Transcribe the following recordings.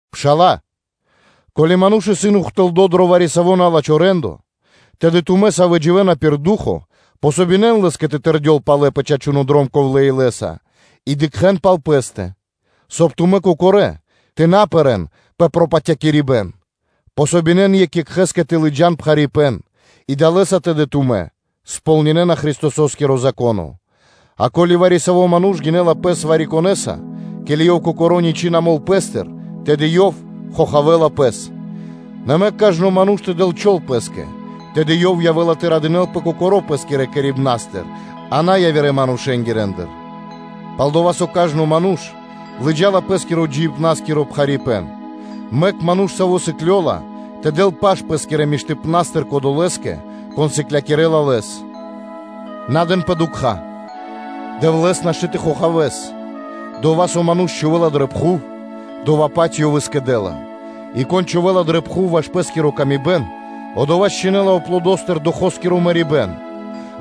Пшала́лэ, ко́ли ману́ш исын ухтылдо дро вари-саво́ на́лачхо рэ́ндо (де́ло), тэды тумэ́, савэ́ дживэ́на пир ду́хо (фа́но), подэн васт (помогинэн) лэ́скэ тэ тэрдёл палэ пэ чачуно́ дром ковлэ́ илэ́са, и дыкхэ́н пал пэ́стэ, соб (кай) тумэ́ кокорэ́ тэ на пэрэ́н пэ пропатякирибэн. Помогинэн екх екхэ́скэ тэ лыджа́н пхарипэ́н, и далэ́са тэды тумэ́ сполнинэна Христосо́скиро Зако́но. А ко́ли вари-саво́ ману́ш гинэ́ла пэс вари-конэса, ке́ли ёв кокоро́ ничы́ на мол пэ́стыр, тэды ёв хохавэла пэс; нэ мэк кажно ману́ш тэ дэл чол (тэ спробинэл пэс) пэ́скэ, тэды ёв явэ́ла тэ радынэ́лпэ кокоро́ пэ́скирэ кэрибнастыр, а на явирэ манушэ́ндыр. Пал-дова́ со кажно ману́ш лыджа́ла пэ́скирэ джиибна́скиро пхарипэ́н. Мэк ману́ш, саво́ сыклёла, тэ дэл паш пэ́скирэ миштыпна́стыр кодолэ́скэ, кон сыклякирэ́ла лэс. На дэнпэ дукха́: Дэвлэ́с нашты́ тэ хохавэ́л; дова́, со ману́ш чхувэ́ла дрэ пхув, дова́-паць ёв и скэдэ́ла. И кон чхувэ́ла дрэ пхув ваш пэ́скири лоч (плоть), одова́ чхинэла криг аплодостыр Духоскиро мэрибэ́н,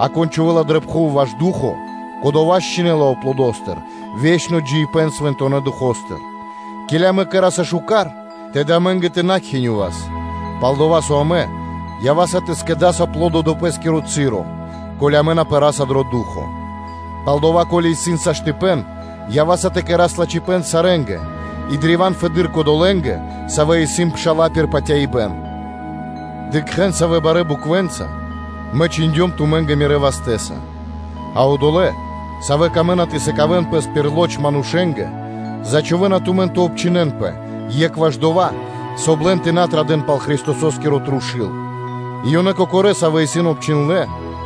а кон чхувэ́ла дрэ пхув ваш Ду́хо (Фа́но), кодова́ счхинэла аплодостыр ве́чно джиибэ́н Свэнтонэ́ Духо́стыр: ке́ли амэ кэра́са шука́р, тэды амэ́нгэ тэ на кхинёвас, пал-дова́ со амэ ява́са тэ скэдас аплодо дро пэ́скиро часо, ко́ли амэ на пэраса дро ду́хо (фа́но). Палдава́, ко́ли исын часо/саштыпэн, то ява́са тэ кэра́с лачхипэ́н сарэ́нгэ, и древа́н фэды́р кодолэ́нгэ, савэ́ исын пша́ла пир патяибэ́н. Дыкхэ́н, савэ́ барэ́ буквэнца мэ чхиндём тумэ́нгэ мирэ́ вастэ́са. А одолэ́, савэ́ камэ́на тэ сыкавэ́н пэс пир лоч манушэ́нгэ, зачхувэна тумэн тэ обчхинэнпэ, екх ваш дова́, соб (кай) лэн тэ на традэ́н пал Христосо́скиро трушу́л. И ёнэ кокорэ́, савэ́ исын обчхиндлэ́,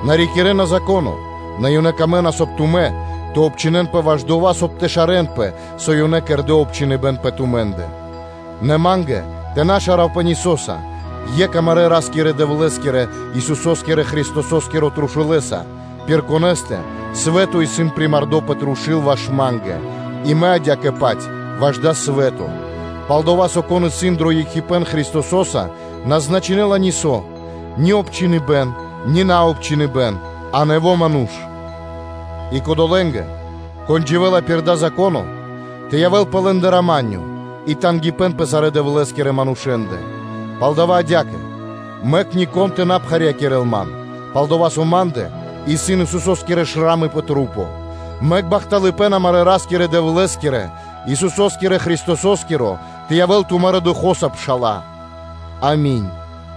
на рикирэ́на Зако́но, нэ ёнэ камэ́на, соб (кай) тумэ́ тэ обчхинэнпэ ваш дова́, соб (кай) тэ шарэнпэ, со ёнэ кэрдэ́ обчхиныбэн пэ тумэ́ндэ. Нэ ма́нгэ тэ на шаравпэ нисоса, екх амарэ́ Ра́скирэ-Дэвлэ́скирэ, Исусо́скирэ Христосо́скирэ трушулэса, пир Конэ́стэ свэ́то исын примардо пэ трушу́л ваш ма́нгэ, и мэ адя́кэ-паць ваш дава́ свэ́то. Пал-дова́ со, кон исын дро екхипэ́н Христосо́са, на значинэла нисо́: ни обчхиныбэн, ни наобчхиныбэн, а нэво́ ману́ш. И кодолэ́нгэ, кон дживэ́ла пир дава́ упхэныбэ́н, тэ явэ́л пэ лэ́ндэ рама́нё (миро) и тангипэ́н (ла́ска) и пэ сарэ́ Дэвлэ́скирэ манушэ́ндэ. Палдава́ адя́кэ: мэк нико́н тэ на пхарьякирэл ман, пал-дова́ со ма́ндэ исын Исусо́скиро шрамы (морима) пэ маса́. Мэк бахталыпэ́н амарэ́ Ра́скирэ-Дэвлэ́скирэ, Исусо́скирэ Христосо́скиро тэ явэ́л тумарэ́ Духо́са, пша́ла. Ами́нь!